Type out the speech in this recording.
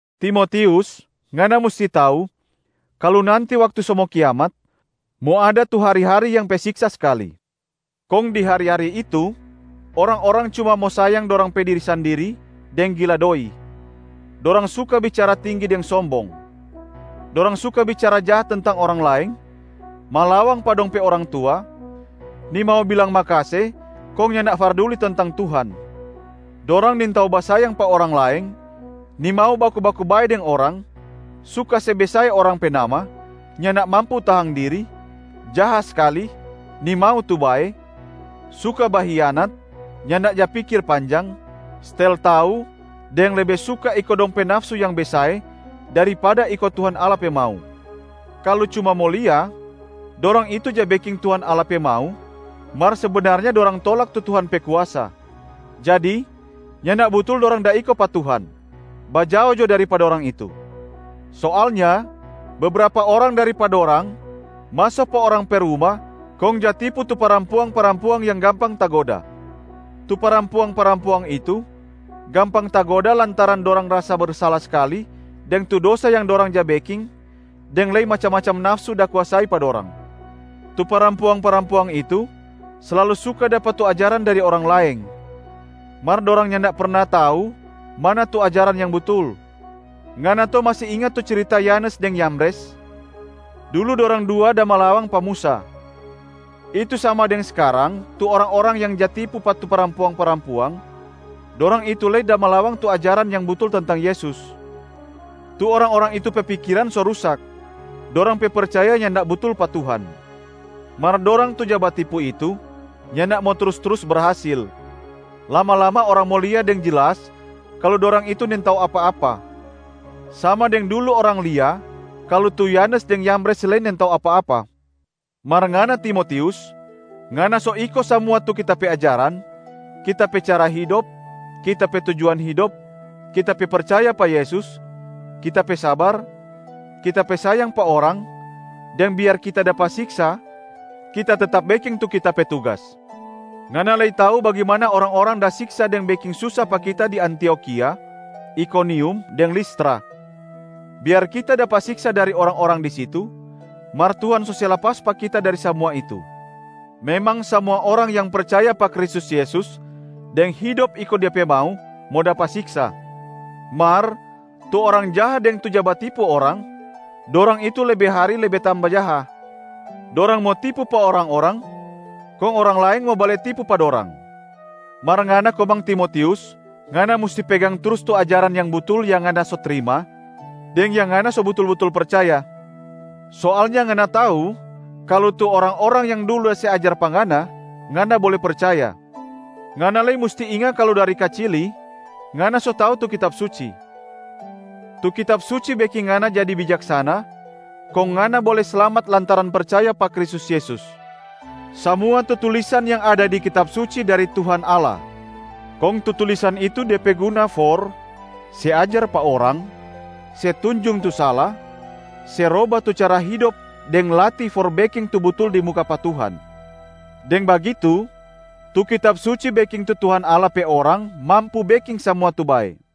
Timotius, ngana musti tau, kalu nanti waktu so mo kiamat, mo ada tu hari-hari yang pe siksa skali. Kong di hari-hari itu, orang-orang cuma mo sayang dorang pe diri sandiri deng gila doi. Dorang suka bicara tinggi deng sombong. Dorang suka bicara jaha tentang orang laeng, malawang pa dong pe orang tua, nimau bilang makase kong nyanda farduli tentang Tuhan. Dorang nintau basayang pa orang laeng, nimau baku-baku bae deng orang, suka se besae orang pe nama, nyanda mampu tahang diri, jaha skali, nimau tu bae, suka bahianat, nyanda ja pikir panjang, stel tau deng lebe suka iko dong pe nafsu yang besae daripada iko Tuhan Allah pe mau. Kalu cuma mo lia, dorang itu ja beking Tuhan Allah pe mau, mar sebenarnya dorang tolak tu Tuhan pe kuasa, jadi nyanda butul dorang da iko pa Tuhan. Bajao jo dari pa dorang itu! Soalnya bebrapa orang dari pa dorang maso pa orang pe ruma kong ja tipu tu parampuang-parampuang yang gampang tagoda. Tu parampuang-parampuang itu gampang tagoda lantaran dorang rasa bersala skali deng tu dosa yang dorang ja beking deng lei macam-macam nafsu da kuasai pa dorang. Tu parampuang-parampuang itu slalu suka dapa tu ajaran dari orang laeng, mar dorang nyanda perna tau mana tu ajaran yang butul. Ngana to masi inga tu cirita Yanes deng Yambres? Dulu dorang dua da malawang pa Musa, itu sama deng skarang tu orang-orang yang ja tipu pa tu parampuang-parampuang, dorang itu lei da malawang tu ajaran yang butul tentang Yesus. Tu orang-orang itu pe pikiran so rusak, dorang pe percaya nyanda butul pa Tuhan. Mar dorang tu ja batipu itu nyanda mo trus-trus berhasil. Lama-lama orang mo lia deng jelas kalu dorang itu nintau apa-apa, sama deng dulu orang lia kalu tu Yanes deng Yambres lei nintau apa-apa. Mar ngana Timotius, ngana so iko samua tu kita pe ajaran, kita pe cara hidop, kita pe tujuan hidop, kita pe percaya pa Yesus, kita pe sabar, kita pe sayang pa orang, deng biar kita dapa siksa kita tetap beking tu kita pe tugas. Ngana lei tau bagimana orang-orang da siksa deng beking susa pa kita di Antiokhia, Ikonium, deng Listra. Biar kita dapa siksa dari orang-orang di situ, mar Tuhan so se lapas pa kita dari samua itu. Memang samua orang yang percaya pa Kristus Yesus deng hidop iko Dia pe mau mo dapa siksa. Mar tu orang jaha deng tu ja batipu orang, dorang itu lebe hari lebe tamba jaha. Dorang mo tipu pa orang-orang kong orang laeng mo bale tipu pa dorang. Mar ngana komang Timotius, ngana musti pegang trus tu ajaran yang butul yang ngana so trima, deng yang ngana so butul-butul percaya. Soalnya ngana tau kalu tu orang-orang yang dulu da se ajar pa ngana, ngana bole percaya. Ngana lei musti inga kalu dari kacili, ngana so tau tu Kitab Suci. Tu Kitab Suci beking ngana jadi bijaksana kong ngana bole slamat lantaran percaya pa Kristus Yesus. Samua tu tulisan yang ada di Kitab Suci dari Tuhan Allah. Kong tu tulisan itu de pe guna for: se ajar pa orang, se tunjung tu sala, se roba tu cara hidop deng latih for beking tu butul di muka pa Tuhan. Deng bagitu, tu Kitab Suci beking tu Tuhan Allah pe orang mampu beking samua tu bae.